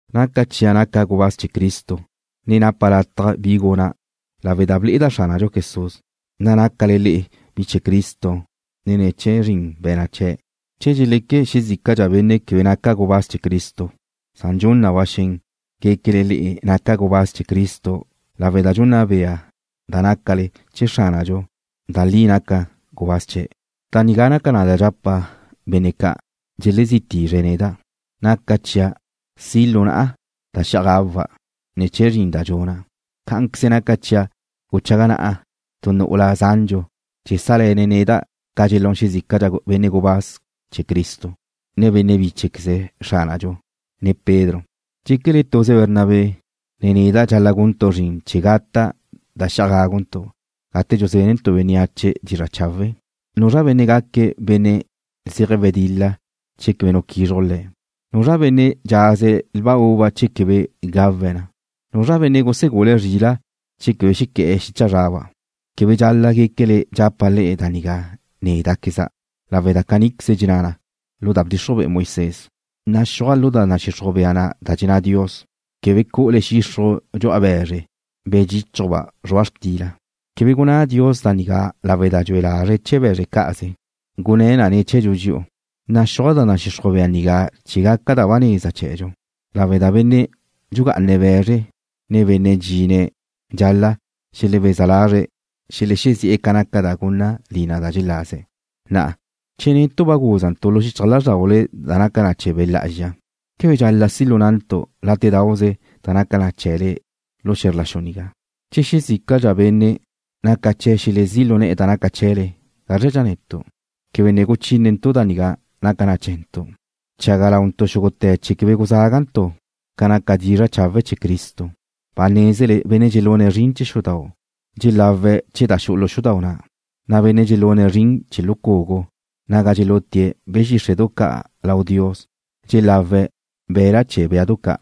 Naca chia' naca' gubáz chee̱ Cristo, ne napa' lataj bi guna' lawe' da ble'eda' Xránadxu Jesús, na' nácale le'e bi chee̱ Cristo ne̱ chee̱ zrin be̱na' chee̱'. Che dxeleque xezícadxa benne' quebe naca' gubáz chee̱ Cristo, san dxun na ba xen guéquele le'e naca' gubáz chee̱' lawe' da dxunna bea da nácale chee̱ Xránadxu da li naca' gubáz chee̱'. Da nigá naca na da dxapa' benne' ca' dxelezí tizre̱' neda': Naca chia' si' lu na'a da xi'aj gawa' ne̱ chee̱ zrin da dxuna'. Cá'anqueze naca chia' guchaga na'a tu nu'ula zandxu chee̱ chéajle̱ne̱' neda' ca dxelún xezícadxa benne' gubáz chee̱ Cristo, ne benne' bíchequeze Xránadxu, ne Pedro. ¿Dxéquele tuze Bernabé, ne neda' dxal-la' guntu' zrin chee̱ gata' da xi'aj gáguntu' gate dxuzénentu' bénneache dizra' chawe'? ¿Nuzra benne' gaque̱' benne' zeje̱' wedil-la che quebe nu quizruj le̱'? ¿Nuzra benne' dxaze̱' lba uva che quebe gawe̱' na? ¿Nuzra benne' gusegule̱' zrila' che quebe xequé̱'e̱ xicha zraba'? Quebe dxal-la' guéquele dxapa' le'e da nigá néda'queza', lawe' da caníqueze dxenná na lu da bdxixruj be'e Moisés. Naxúaj lu da nadxixruj bea na da dxenná Dios: Quebe cu'ule xixruj dxu'a be̱zre, be̱ dxíchuba' zrua' xtila. Quebe gunná Dios da nigá lawe' da dxue lazre̱' chee̱ be̱zre cá'aze. Gunné̱' na ne̱ chee̱dxu dxi'u. Naxúaj da nadxixruj bea nigá chee̱ gaca da ba neza chee̱dxu, lawe' da benne' dxugá'ane̱' be̱zre, ne benne' dxine̱' dxal-la' xelebeza lazre̱' xelexezi'e̱ ca naca da gunna lina da xelaze̱'. Na'a, che netu' ba gúzantu' lu xichaj lázrdaule da naca na chee̱ Be' Lá'azxa, ¿quebe dxal-la' si' lu na'ntu' látedauze da naca chee̱le lu xe̱zr la xu nigá? Che xezícadxa benne' naca chee̱' xelezí' lu ne̱'e̱ da naca chee̱le, ¿gázradxa netu'? Quebe ne guchínentu' da nigá naca na chee̱ntu'. Bchaga launtu' xúgute̱ chee̱ quebe guzágantu' ca naca dizra' chawe' chee̱ Cristo. Ba nézele benne' dxelune̱' zrin chee̱ xudau' dxelawe̱' chee̱ da xu'u lu xudau' na', na' benne' dxelune̱' zrin chee̱ lu cugu naga dxelutie̱' be̱ xíxre'du ca' lau Dios dxelawe̱' be̱la' chee̱ béadu ca'.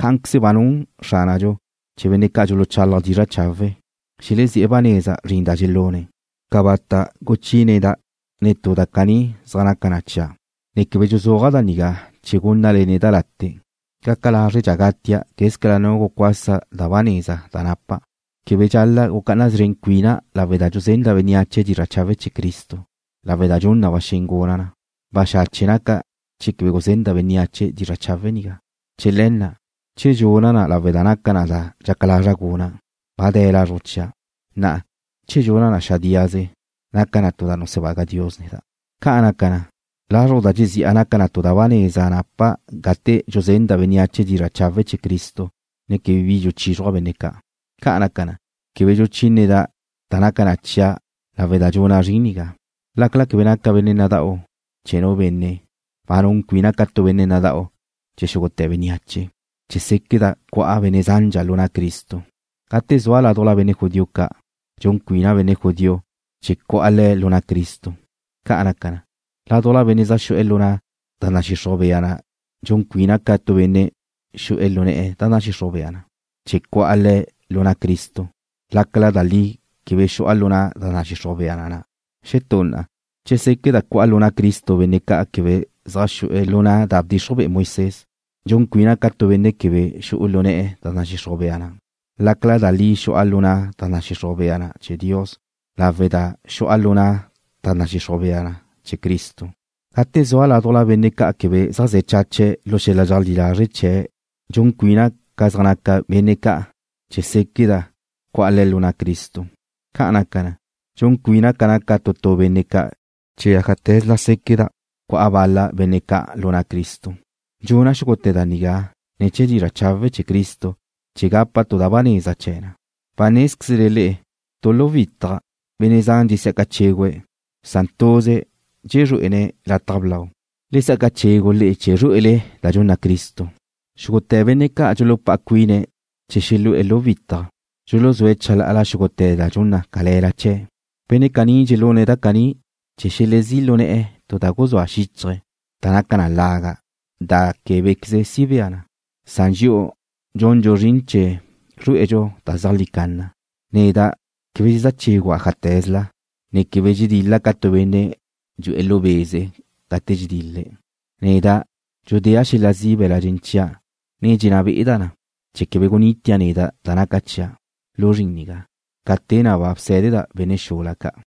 Cá'anqueze ba nun Xránadxu chee̱ benne' dxuluchalaje̱' dizra' chawe', xelezí'e̱ ba neza zrin da dxelune̱'. Cabata' guchíneda' netú da caní zaj naca na chia', ne quebe dxuzúaja' da nigá chee̱ gúnnale neda' late'. Gaca lázredxa' gatia' quézcala nu gucuasa da ba neza da napa'. Quebe dxal-la' gucá'ana szren cuina' lawe' da dxuzenda' bénneache dizra' chawe' chee̱ Cristo, lawe' da dxun na ba xen guna' na. Baxache' naca' che quebe guzenda' bénneache dizra' chawe' nigá. Chee̱ le̱ na', che dxuna' na lawe' da naca na da dxaca lazra' guna', ba de̱ lazruj chia'. Na'a, che dxuna' na xadíaze, naca na tu da nusebaga Dios neda'. Ca' naca na, lazruj da dxezi'a naca na da ba neza napa' gate dxuzenda' bénneache dizra' chawe' chee̱ Cristo, ne quebe bi dxuchízruja' benne' ca'. Ca' naca na, quebe dxuchíneda' da naca na chia' lawe' da dxuna' zrin nigá. Lácala quebe naca' benne' nada'u chee̱ nu benne', ba nun cuina' ca tu benne' nada'u chee̱ xúgute̱ bénneache, chee̱ séqueda' cu'a benne' zandxa lu na' Cristo. Gate zua' ládujla benne' judío ca', dxun cuina' benne' judío chee̱ cu'a le̱' lu na' Cristo. Ca' naca na, ládujla benne' zaj xu'e̱ lu na' da nadxixruj bea na dxun cuina' ca tu benne' xu'e̱ lu na' da nadxixruj bea na, chee̱ cu'a le̱' lu na' Cristo lácala da li quebe xu'a lu na' da nadxixruj bea na na'. Xetú na'a, chee̱ séqueda' cu'a lu na' Cristo benne' ca' quebe zaj xu'e̱ lu na' da bdxixruj be'e Moisés, dxun cuina' ca tu benne' quebe xu'e̱ lu na' da nadxixruj bea na na', lácala da li xu'a lu na' da nadxixruj bea na chee̱ Dios lawe' da xu'a lu na' da nadxixruj bea na chee̱ Cristo. Gate zua' ládujla benne' ca' quebe zaj ze̱ chache̱' lu xel-la dxeajlí lazre' chee̱' dxun cuina' ca zaj naca benne' ca' chee̱ séqueda' cu'a le̱' lu na' Cristo. Ca' naca na, dxun cuina' ca naca tu tu benne' ca' chee̱ ájate̱zla séqueda' cu'a bal-la benne' ca' lu na' Cristo. Dxuna' xúgute̱ da nigá ne̱ chee̱ dizra' chawe' chee̱ Cristo chee̱ gapa' tu da ba neza chee̱ na. Ba nézquezle le'e tu lu da huitaj benne' zan dxesí'aca chégüe̱' na' tuze̱' dxezrué'ene̱' lataj blau. Le sa'aca chegu le'e chee̱ zrué'ele da dxunna Cristo. Xúgute̱ benne' ca' dxulupá'a cuine̱' chee̱ xelu'e̱ da huitaj, dxuluzúe̱' chalá'ala xúgute̱ da dxun na cale̱la chee̱'. Benne' caní dxelune̱' da caní chee̱ xelezí' lu ne̱'e̱ tu da guzúe̱' xíchaje̱' da naca na laga' da québequeze si bea, san dxi'u dxundxu zrin chee̱ zrué'edxu da zeajlí canna. Neda' quebe dxezá chégua' ájate̱zla, ne quebe dxedil-la' ca tu benne' dxu'e̱ lu be'ze gate dxedil-le̱'. Neda' dxudéa' xel-la zi' be̱la' dxen chia', ne dxenná be'eda' na, chee̱ quebe gunitia' neda' da naca chia' lu zrin nigá, ca te na' ba bsé̱deda' benne' xula ca'.